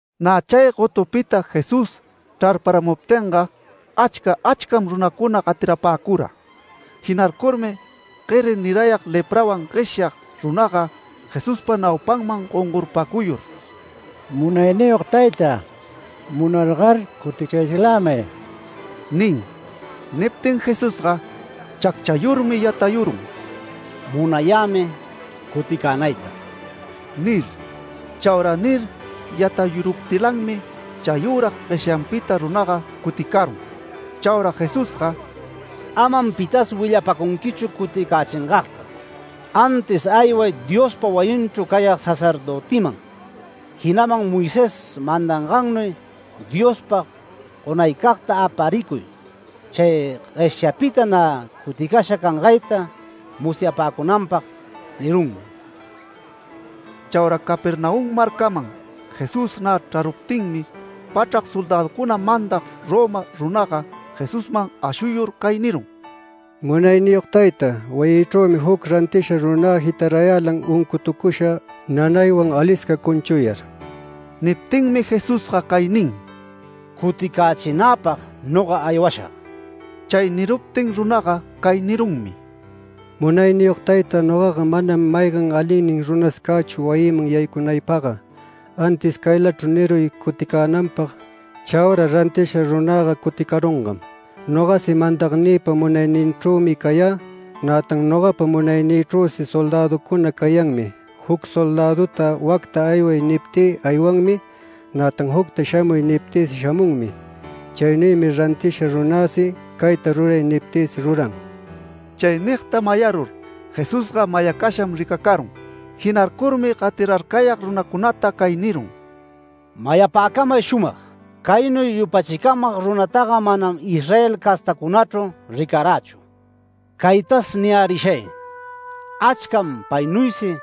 Nä chay gotupita Jesús chrarparamuptinga achca achcam runacuna gatirapäcura. Jinarcurmi gueri nirayag leprawan gueshyag runaga Jesuspa naupanman gongorpacuyur “Munayniyog tayta, munargar cuticayächilämay” nin. Niptin Jesusga chacchayurmi yatayurun “Munayämi cuticänayta” nir. Chaura nir yatayurpuptilanmi chayüra gueshyanpita runaga cuticarun. Chaura Jesusga “Amam pitas willapacunquichu cuticächingagta, antis ayway Diospa wayinchru cayag sacerdötiman, jinaman Moisés mandangannuy Diospag gonaycagta aparicuy chay gueshyapita nä cuticasha cangayta musyapäcunanpag” nirunmi. Chaura Capernaum marcaman Jesús nä chraruptinmi, pachrac soldäducuna mandag Roma runaga Jesusman ashuyur cay nirun: “Munayniyog tayta, wayïchrümi juc rantisha runä jitarayälan uncutucusha nanaywan alisca cunchuyar”. Niptinmi Jesusga cay nin: “Cuticächinäpag noga aywashag”. Chay niruptin runaga cay nirunmi: “Munayniyog tayta, nogaga manam maygan alinnin runas cächu wayïman yaycunaypagga. Antis caylachru niruy cuticänanpag, chaura rantisha runäga cuticarungam. Nogasi mandagnïpa munayninchrümi cayä. Nätan nogapa munaynïchrüsi soldäducuna cayanmi. Juc soldädüta ‘Wacta ayway’ niptï aywanmi. Nätan jucta ‘Shamuy’ niptïsi shamunmi. Chaynuymi rantisha runäsi ‘Cayta ruray’ niptïsi ruran”. Chay nigta mayarur Jesusga mayacasham ricacarun. Jinarcurmi gatirarcayag runacunata cay nirun: “Mayapäcamay shumag: Caynuy yupachicamag runataga manam Israel castacunachru ricarächu. Caytas niyärishay: Achcam paynuysi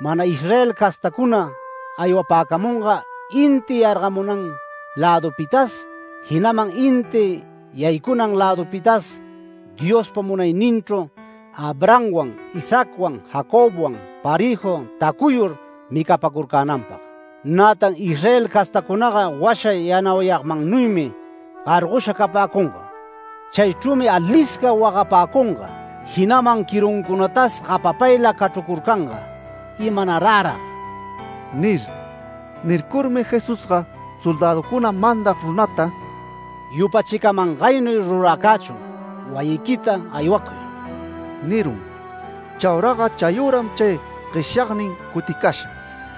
mana Israel castacuna aywapäcamunga inti yargamunan lädupitas jinaman inti yaycunan lädupitas Diospa munayninchru Abrahamwan Isaacwan Jacobwan parëju tacuyur micapäcurcänanpag. Nätan Israel castacunaga washa yanauyagmannuymi gargosha capäcunga. Chaychrümi alisca wagapäcunga, jinaman quiruncunatasi gapapayla cachrucurcanga ‘¡Imanarärag!’ nir”. Nircurmi Jesusga soldäducuna mandag runata “Yupachicamangaynuy ruracächun, wayiquita aywacuy” nirun. Chauraga chayüram chay gueshyagnin cuticasha.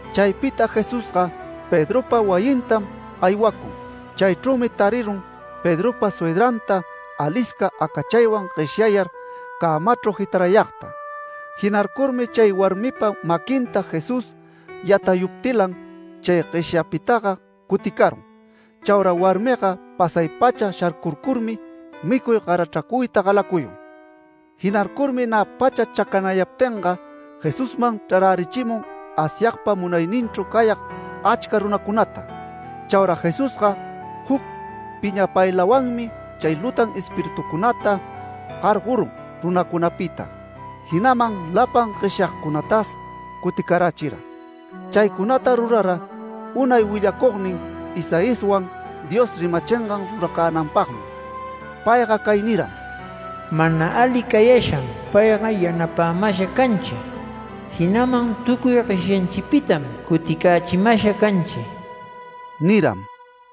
Chaypita Jesusga Pedropa wayintam aywacun. Chaychrümi tarirun Pedropa suydranta alisca acachaywan gueshyayar cämachru jitarayagta. Jinarcurmi chay warmipa maquinta Jesús yatayuptilan chay gueshyapitaga cuticarun. Chaura warmiga pasay-pacha sharcurcurmi micuy garachracuyta galacuyun. Jinarcurmi nä pacha chacanayaptinga, Jesusman chrarärichimun Asyagpa munayninchru cayag achca runacunata. Chaura Jesusga juc piñapaylawanmi chay lutan espiritucunata gargorun runacunapita, jinaman lapan gueshyagcunatas cuticarachira. Chaycunata rurara unay willacugnin Isaiaswan Dios rimachingan ruracänanpagmi. Payga cay niram: “Mana ali cayasham payga yapapamasha canchi. Jinaman tucuy gueshyanchipitam cuticächimasha canchi” niram.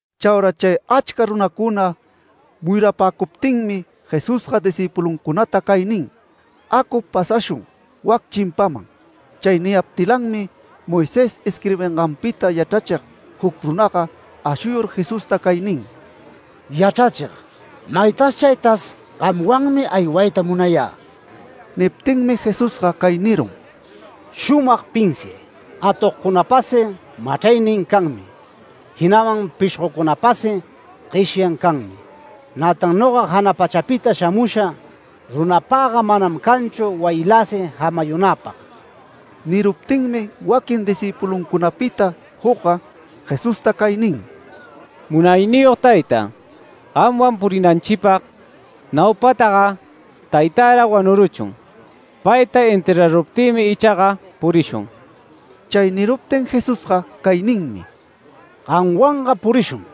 Chaura chay achca runacuna muyurapäcuptinmi Jesusga discïpuluncunata cay nin: “Acu pasashun wac chimpanman”. Chay niyaptilanmi Moisés isquirbinganpita yachrachig juc runaga ashuyur Jesusta cay nin: “Yachrachig, maytas chaytas gamwanmi aywayta munayä”. Niptinmi Jesusga cay nirun: “Shumag pinsiay. Atogcunapasi machraynin canmi jinaman pishgocunapasi gueshan canmi. Nätan noga jana pachapita shamusha runapagga manam canchu wayiläsi jamayunäpag”. Niruptinmi waquin discïpuluncunapita jucga Jesusta cay nin: “Munayniyog tayta, gamwan purinanchipag naupataga taytärag wanuruchun. Payta enterraruptïmi ichaga purishun”. Chay niruptin Jesusga cay ninmi: “Gamwanga purishun.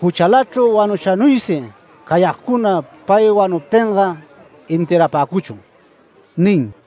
Juchalachru wanushanuysi cayagcuna pay wanuptinga enterrapäcuchun” nin.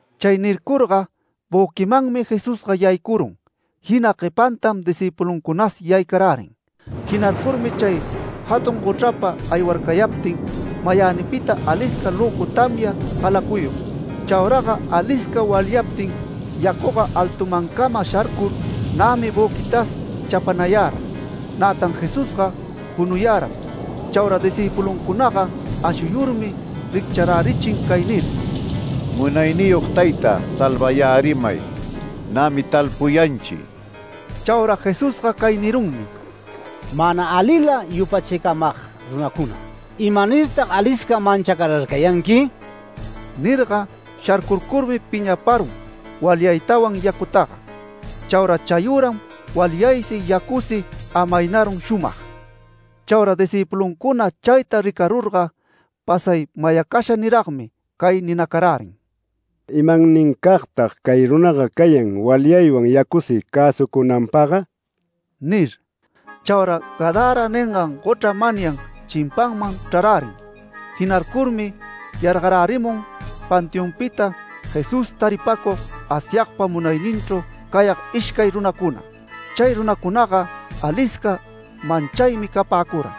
Chay nircurga büquimanmi Jesusga yaycurun, jina guepantam discïpuluncunas yaycarärin. Jinarcurmi chay jatun gochrapa aywarcayaptin mayänipita alisca löcu tamya galacuyun. Chauraga alisca walyaptin yacuga altumancama sharcur nämi büquitas chapanayara. Nätan Jesusga punuyaram. Chaura discïpuluncunaga ashuyurmi riccharärichin cay nir: “Munayniyog tayta, salvayärimay. Nämi talpuyanchi”. Chaura Jesusga cay nirunmi: “Mana alila yupachicamag runacuna, ¿imanirtag alisca manchacararcayanqui?” nirga, sharcurcurmi piñaparun walyaytawan yacutaga. Chaura chayüram walyaysi yacusi amaynarun shumag. Chaura discïpuluncuna chayta ricarurga pasay mayacasha niragmi cay ninacarärin: “¿Imannincagtag cay runaga cayan walyawan yacusi cäsucunanpagga?” nir. Chaura Gadara ningan gochra manyan chimpaman chrarärin. Jinarcurmi yargarärimun panteonpita Jesús taripäcug Asyagpa munayninchru cayag ishcay runacuna. Chay runacunaga alisca manchaymi capäcura.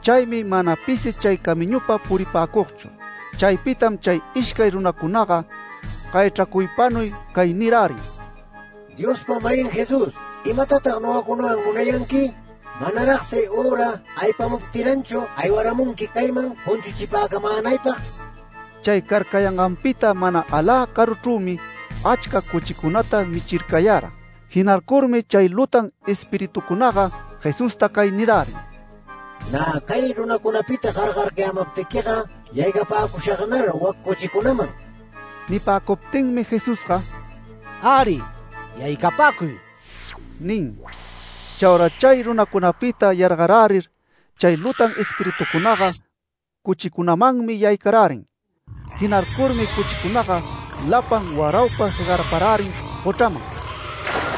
Chaymi mana pisi chay camiñupa puripäcugchu. Chaypitam chay ishcay runacunaga gayachracuypanuy cay nirärin: “Diospa-mayin Jesús, ¿imatatag nogacunawan munayanqui? Manaragsi üra aypamuptilanchu aywaramunqui cayman cunchuchipäcamänaypag”. Chay carcayanganpita mana alä caruchrümi achca cuchicunata michircayara. Jinarcurmi chay lutan espiritucunaga Jesusta cay nirärin: “Nä cay runacunapita gargarcayämaptiquiga, yaycapäcushagnar wac cuchicunaman”. Nipäcuptinmi Jesusga “Äri, yaycapäcuy” nin. Chaura chay runacunapita yargarärir, chay lutan espiritucunaga cuchicunamanmi yaycarärin. Jinarcurmi cuchicunaga lapan, waraupa jegarparärin gochraman.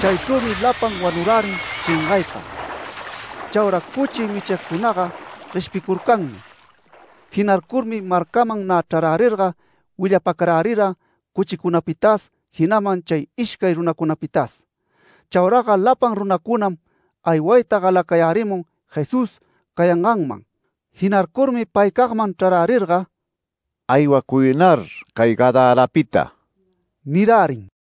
Chaychrümi lapan wanurärin shengaypa. Chaura cuchi michigcunaga gueshpicurcanmi. Jinarcurmi marcaman nä chrarärirga willapäcarärira cuchicunapitas jinaman chay ishcay runacunapitas. Chauraga lapan runacunam aywayta galacayärimun Jesús cayanganman. Jinarcurmi paycagman chrarärirga “Aywacuynar cay Gadarapita” nirärin.